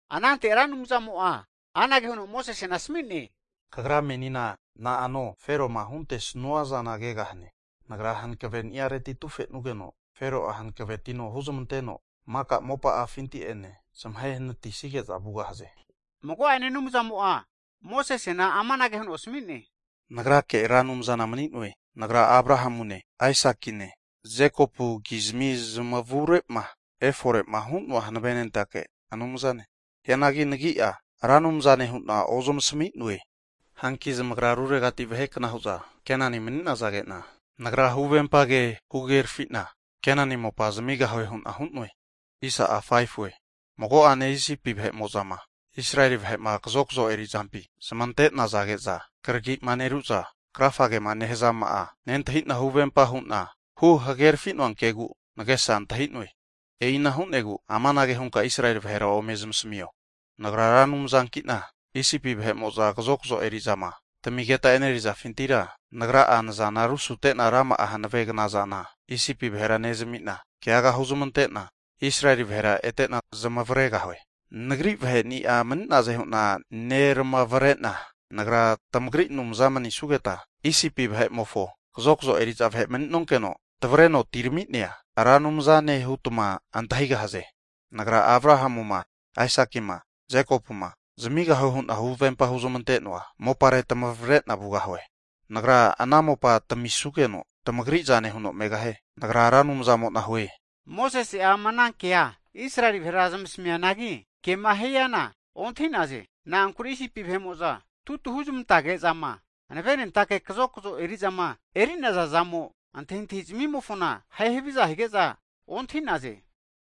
Anante Ra Anumzamo'a anage huno Mosesena asmi'ne, Kagra menina na'ano Feroma huntesnua zana kegahane. Nagra hankaveni'areti atufenugeno, Fero'a hankavetino hunezmanteno, maka mopa'afinti'enena zamahe'natisige'za vugahaze. Mago'ane Anumzamo'a Mosesena amanage huno asmi'ne, Nagrake Ra Anumzana mani'noe. Nagra Abrahamune Aisakine Jekopukizmi zamavure'ma efore'ma hu'noa hanavenentake Anumzane, hianagi nagi'a Ra Anumzane hu'na ozamasmi'noe. Hanki zamagra ruregati vahekna hu'za Kenani mani'nazage'na, Nagra huvempa ke huhagerafina Kenani mopa zamigahue hu'na hu'noe. Mago'ane Isipi vahe'mo'ma Israeli vahe'ma kazokzo eri'zampi zmante'nazage'za kragi'ma neru'za krafage'ma nehazama'a nentahi'na huvempa hu'na huhagerafi'noa kegu nagesa antahi'noe. E'ina hu'negu amanage hunka Israeli vahera ome zmasmio, Nagra Ra Anumzanki'na, Isipi vahe'mo'za kazokzo eri'zama tamigeta e'nerizafintira, Nagra'a nazana rusute'na rama'a hanave knazana Isipi vahera nezami'na, keaga huzmante'na Israeli vahera ete'na zamavaregahue. Nagri vaheni'a mani'naze hu'na neramavrena, Nagra tamagri Anumza manisugeta, Isipi vahe'mofo kazokzo eri'za vahe mani'nonkeno tavreno atirami'nea Ra Anumzane hutma antahigahaze. Nagra Abrahamu'ma Aisaki'ma Jekopuma zamigahue hu'na huvempama huzmante'noa mopare tamavre'na vugahue. Nagra ana mopa tamisugeno tamagri zane huno megahie. Nagra Ra Anumzamo'na hue! Mosese'a ama ana kea Israeli vahe zmasmi'neanagi, kema hiana ontahi'naze. Na'ankure Isipi vahe'mo'za tutu huzmantage'zama hanavenentake kazokzo eri'zama eri'naza zamo antahintahi zmimofona ahe haviza hige'za ontahi'naze.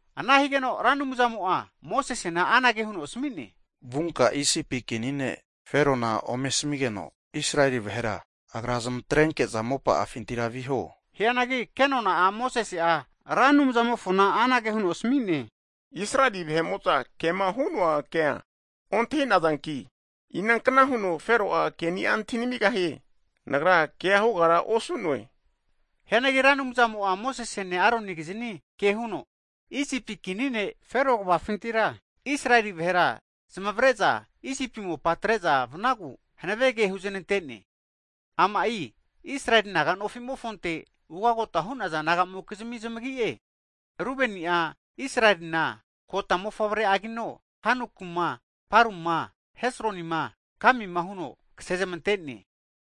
Ana higeno Ra Anumzamo'a Mosesena anage huno asami'ne, Vunka Isipi kini ne' Ferona ome asamigeno, Israeli vahera agra zmatrenke'za mopa'afintira viho. Hianagi kenona'a Mosese'a Ra Anumzamofona anage huno asami'ne, Israeli vahe'mo'za kema hu'noa kea ontahi'nazanki, inankna huno Fero'a ke'ni'a antahi namigahie? Nagra kea hugara osu'noe. Hianagi Ra Anumzamo'a Mosesene Aronigiznia ke huno, Isipi kini ne' Fero kvafintira, Israeli vahera zmavre'za Isipi mopa atre'za vnagu hanave ke huzanante'ne. Ama'i Israeli naga nofi'mofonte ugagota hu'naza naga'mokizmi zmagi'e. Rubeni'a Israelina (Jekopu) kota mofavre'agino, Hanoku'ma Paru'ma Hesroni'ma Kami'ma, huno kasezmante'ne.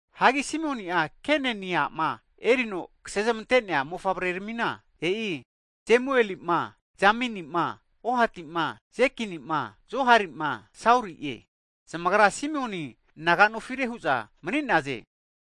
Hagi Simioni'a Keneni a'ma erino kasezmante'nea mofavre'rmina, e'i Jemueli'ma Jamini'ma Ohati'ma Jekini'ma Johari'ma Sauri'e. Zamagra Simioni naga nofire hu'za mani'naze.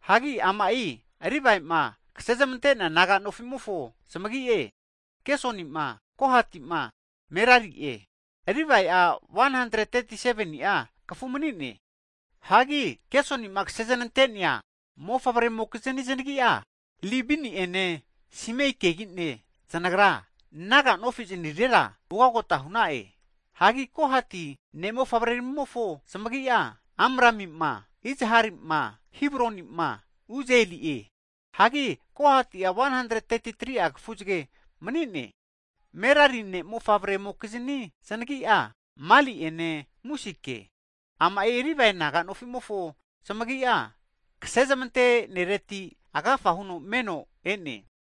Hagi ama'i Livae'ma kasezmante'nea naga nofi'mofo zamagi'e, Gesoni'ma Kohati'ma Merari'e. Livae'a 137ni'a kafu mani'ne. Hagi Gesoni'ma kasezanante'nea mofavremokiznia znagi'a, Libini'ene Simeikegi'ne zanagra naga nofi zanirera ugagota hu'na'e. Hagi Kohati ne'mofavreramimofo zamagi'a, Amrami'ma Izhari'ma Hebroni'ma Uzieli'e. Hagi Kohati'a 133'a kafuzage mani'ne. Merari ne' mofavre'mokizni znagi'a, Mali'ene Musike. Ama'i Livae naga nofi'mofo zmagi'a kasezmante'nereti agafa huno meno e'ne.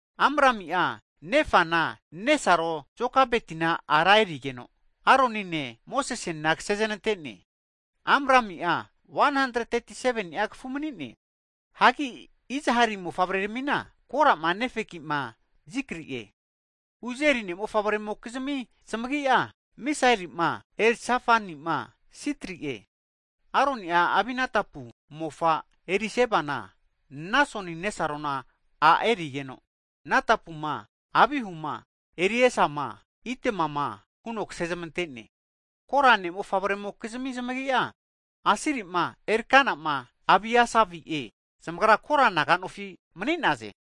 Amrami'a nefana nesaro Jokebetina ara erigeno, Aronine Mosesene kasezanante'ne. Amrami'a 137ni'a kafu mani'ne. Hagi Izhari mofavreramina, Kora'ma Nefegi'ma Zikri'e. Uzieli ne' mofavremokizmi zamagi'a, Misaeli'ma, Elzafani'ma Sitri'e. Aroni'a Aminatapu mofa Erisebana Nasoni nesarona a' erigeno, Natapuma Abihuma Eriasama Itamama huno kasezmante'ne. Kora ne' mofavremokizmi zamagi'a, Asiri'ma Erkana'ma Abiasavi'e. Zamagra Kora naga nofi mani'naze.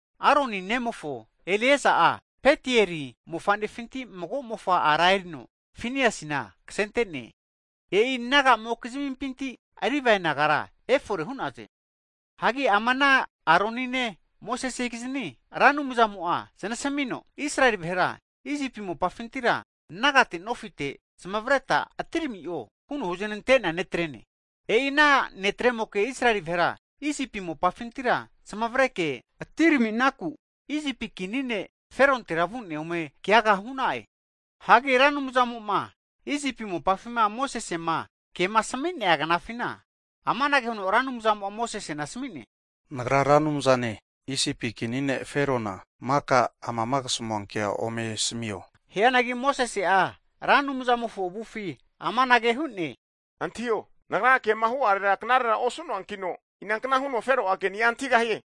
Aroni nemofo Eleaza'a Putieri mofa'nefinti mago mofa ara erino Finiasina kasente'ne. E'i naga'mokizmimpinti Livae nagara efore hu'naze. Hagi ama ana Aroni'ne Mosesegizni Ra Anumzamo'a znasmino, Israeli vahera Isipi mopafintira nagate nofite zmavreta atirami'o huno huzanante'nea ne'trene. E'i ana ne'tremoke Israeli vahera Isipi mopafintira zamavareke atiraminaku, Isipi kini ne' Ferontera vu'ne ome keaga hu'na'e. Hagi Ra Anumzamo'ma Isipi mopafima Mosesema kema asami'nea knafina, amanage huno Ra Anumzamo'a Mosesena asmi'ne, Nagra Ra Anumzane, Isipi kini ne' Ferona maka amama kasamua kea ome asmio. Hianagi Mosese'a Ra Anumzamofo avufi amanage hu'ne, Antahio, nagra kema hu'arera knarera osu'noankino, inankna huno Fero'a keni'a antahigahie?